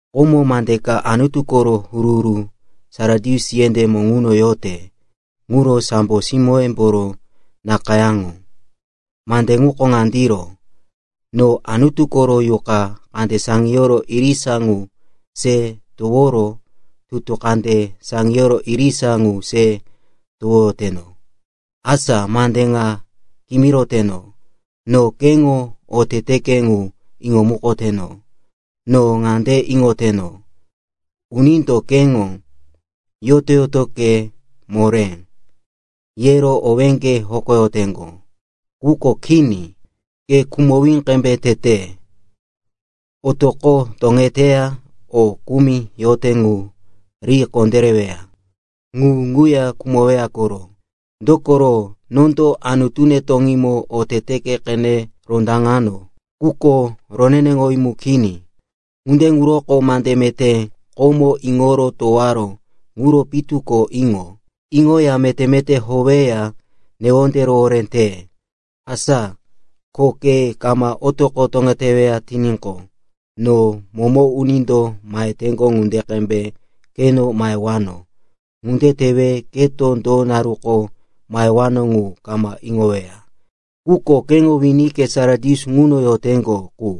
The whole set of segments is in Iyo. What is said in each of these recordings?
“Ko mande ka Anutu koro huru-huru Sardis yendémo ŋuno yote quro sambo simóyemboro nakayáŋo. Mande ŋuko ŋandiro: No Anutu koro yuqa kande saŋiyoro irisa ŋu se toworo tutu kande saŋiyoro irisa ŋu se towoyoteno. Asa mande ŋa kimiroteno. No keŋo oteteke ŋu iŋomukoteno. No ŋande iŋoteno, unindo keŋo, ‘Yoto-yotoke moré,’ yero owéŋge hokoyoteŋgo. Quko kini, ke khumowí qembe tete. Otoqo toŋeteya o kumi yote ŋu ri kondéreweya. Ŋu ŋuya khumoweya koro. Dokoro nondo Anutune toŋímo oteteke qene rondaŋano, quko roneneŋowí mu kini. Ŋunde ŋuroko mande meté komo iŋoro towaró ŋuro pitu ko iŋo. Iŋoya meté-meté howeya newonde rohoré te. Asa ko ke kama otoqo toŋeteweya tiníqo, no momo unindo maheteŋgo ŋunde qembe keno mahewano. Ŋunde tewe keto do naruko mahewano ŋu kama iŋoweya. Quko keŋo winike Sardis ŋuno yoteŋgo qu,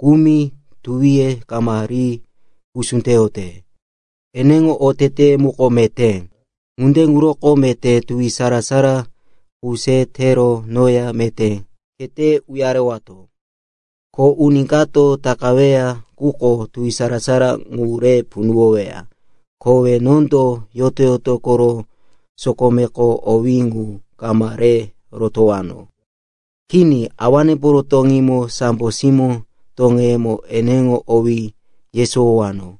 kumi tuwiye kama ri pusú teyote. Eneŋo oteteye muko meté, ŋunde ŋuroko meté tuwi sara-sara qu se tero noya meté khete uyarewato. Ko uni kato takaweya quko tuwi sara-sara ŋu re punuwoweya. Kowe nondo yoto-yoto koro sokomeko owí ŋu kama re rotowano. Kini, Awanemboro toŋímo sambo simó toŋeyemo eneŋo owí yesowowano.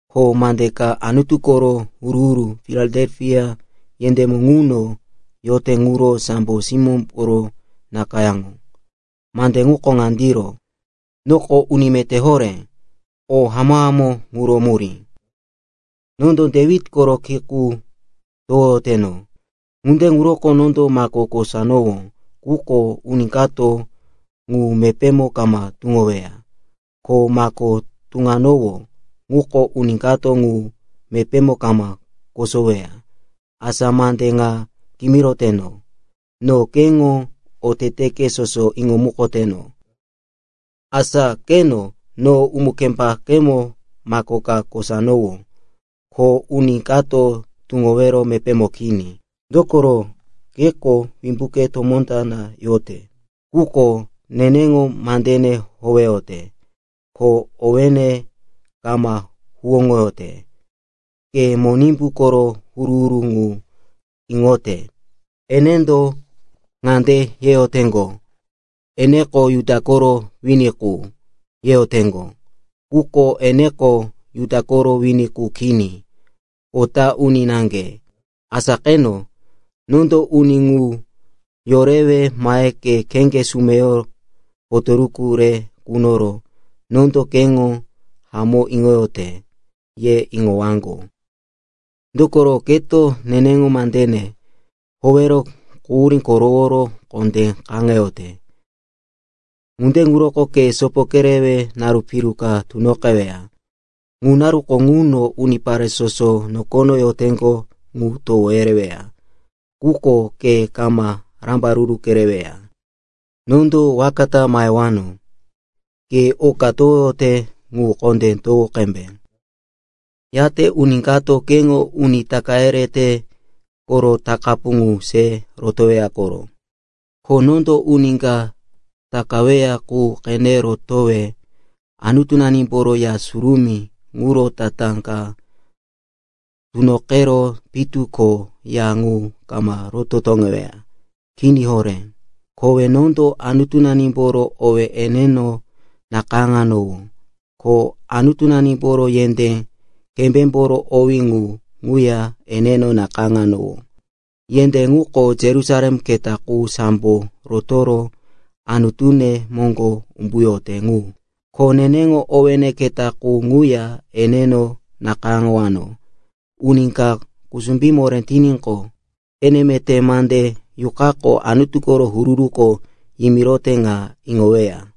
“Ko mande ka Anutu koro huru-huru Filadelfia yendémo ŋuno yote quro sambo simóyemboro nakayáŋo. Mande ŋuko ŋandiro: Noko uni meté horé, o hamó-hamó ŋuro murí. Nondo Dewit koro ki qu towoyoteno, ŋunde ŋuroko nondo mako kosanowó quko uni kato ŋu mepémo kama tuŋoweya. Ko mako tuŋanowó quko uni kato ŋu mepémo kama kosoweya. Asa mande ŋa kimiroteno. No keŋo oteteke soso iŋomukoteno. Asa qeno, no umu-kembakemo mako ka kosanowó, ko uni kato tuŋowero mepémo kini. Dokoro keko wimbuke tomó ta na yote, quko neneŋo mandene howeyote, ko owéne kama huwóŋoyote. Ke Monimbu koro huru-huru ŋu iŋote, enendo ŋande yeyoteŋgo, eneko Juda koro wini qu, yeyoteŋgo. Quko eneko Juda koro wini qu kini, kota uni naŋge. Asa qeno, nondo uni ŋu yorewe mahe ke kheŋge sumeyo potoruku re kunoro, nondo keŋo hamó iŋoyote, yero iŋowaŋgo. Dokoro keto neneŋo mandene howero quhurí koroworo kondé kaŋeyote. Ŋunde ŋuroko ke sopo kerewe naru piyimi ka tunoqeweya. Ŋu naruko ŋuno unipare soso nokono yoteŋgo ŋu towo yereweya, quko ke kama rambaruru kereweya. Nondo waka ta mahewano. Ke oka towoyote, ŋu kondé towo qembe. Yate uni kato keŋo uni taka yerete koro takapu ŋu se rotoweya koro. Ko nondo uni ka takaweya qu qene rotowe Anutunemboro Ya Surumí ŋuro tatá ka tunoqero pitu ko ya ŋu kama roto toŋeweya. Kini horé. Kowe nondo Anutunemboro owí eneno nakayáŋowano, ko Anutunemboro yendé kembémboro owí ŋu ŋuya eneno nakayáŋowano. Yendé ŋuko Yerusalem keta qu sambo rotoro Anutune moŋgo umbuyote ŋu. Ko neneŋo owéne keta qu ŋuya eneno nakayáŋowano. Uni ka kusumbí moré tiníqo, ene meté mande Yuqako Anutu koro huru-huruko yimirote ŋa iŋoweya.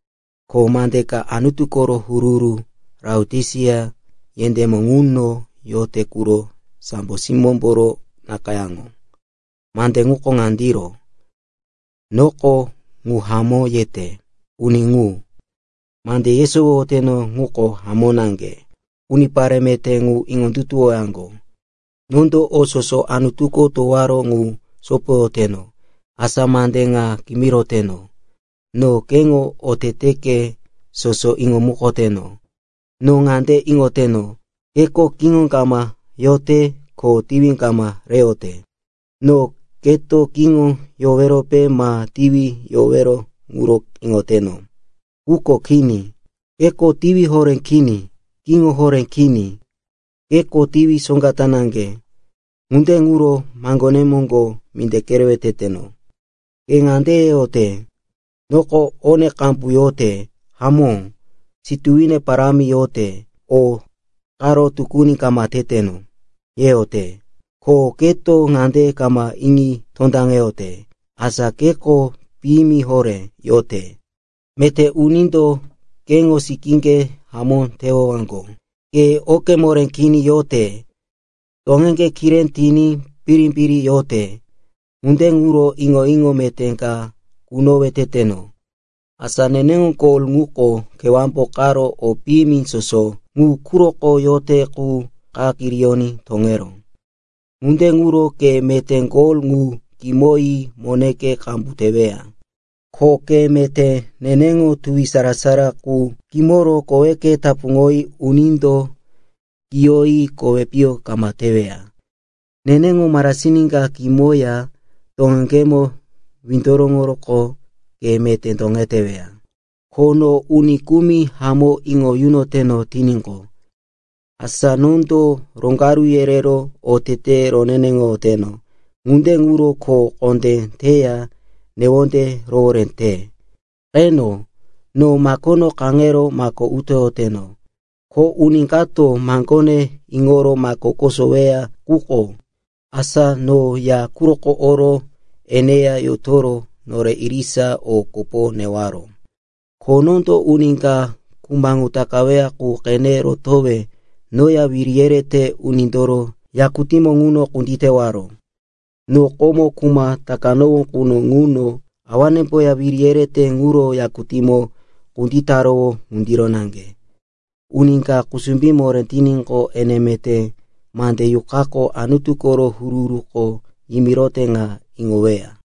“Ko mande ka Anutu koro huru-huru Laotisia yendémo ŋuno yote quro sambo simóyemboro nakayáŋo. Mande ŋuko ŋandiro: Noko, ‘Ŋu hamó yete,’ uni ŋu. Mande yesowoyoteno ŋuko hamó naŋge, unipare meté ŋu iŋondutuwowaŋgo. Nondo o soso Anutuko towaró ŋu sopoyoteno. Asa mande ŋa kimiroteno. No keŋo oteteke soso iŋomukoteno. No ŋande iŋoteno, keko kiŋo kama yote ko tiwi kama reyote. No keto kiŋo yowerope ma tiwi yowero ŋuro iŋoteno. Quko kini. Keko tiwi horé kini, kiŋo horé kini. Keko tiwi soŋga ta naŋge. Ŋunde ŋuro maŋgone moŋgo minde kerewe teteno. Ke ŋande yeyote, ‘Noko one qambu yote. Hamó, situwine parámi yote, o karo tukuni kama teteno,’ yeyote. Ko keto ŋande kama iŋi tondaŋeyote, asa keko piyimi horé yote, meté unindo keŋo sikíŋge hamó tewaŋgo. Ke oke moré kini yote, toŋeŋge kiré tiní, birimbiri yote. Ŋunde ŋuro iŋo-iŋo meté ka kunowe teteno. Asa neneŋo gol ŋuko kewámbo qaro o piyimi soso ŋu quroko yote qu qa kiriyoní toŋeró. Ŋunde ŋuro ke meté gol ŋu kimoyi moneke qambu teweya. Ko ke meté neneŋo tuwi sara-sara qu kimoro koweke tapuŋoyi unindo kiyoyi kowi piyo kama teweya. Neneŋo marasin ka kimoya toŋeŋgemo windoroŋoroqo ke meté toŋeteweya. Ko no uni kumi hamó iŋo yunoteno tiníqo, asa nondo roŋgaru yerero oteteye roneneŋoyoteno. Ŋunde ŋuro kho kondé teya newonde rohoré te. Qeno, no makono kaŋero mako utoyoteno. Ko uni kato maŋgone iŋoro mako kosoweya quko, asa no ya quroko oro eneya yotoro nore irisa o kopo neyowaro. Ko nondo uni ka kuma ŋu takaweya qu qene rotowe noya wiri yerete unindoro yakutínemo ŋuno kunditewaro. No komo kuma takanowó quno ŋuno awanemboya wiri yerete ŋuro yakutíŋomo kunditarowó ŋundiro naŋge. Uni ka kusumbí moré tiníqo, ene meté mande Yuqako Anutu koro huru-huruko yimirote ŋa iŋoweya.”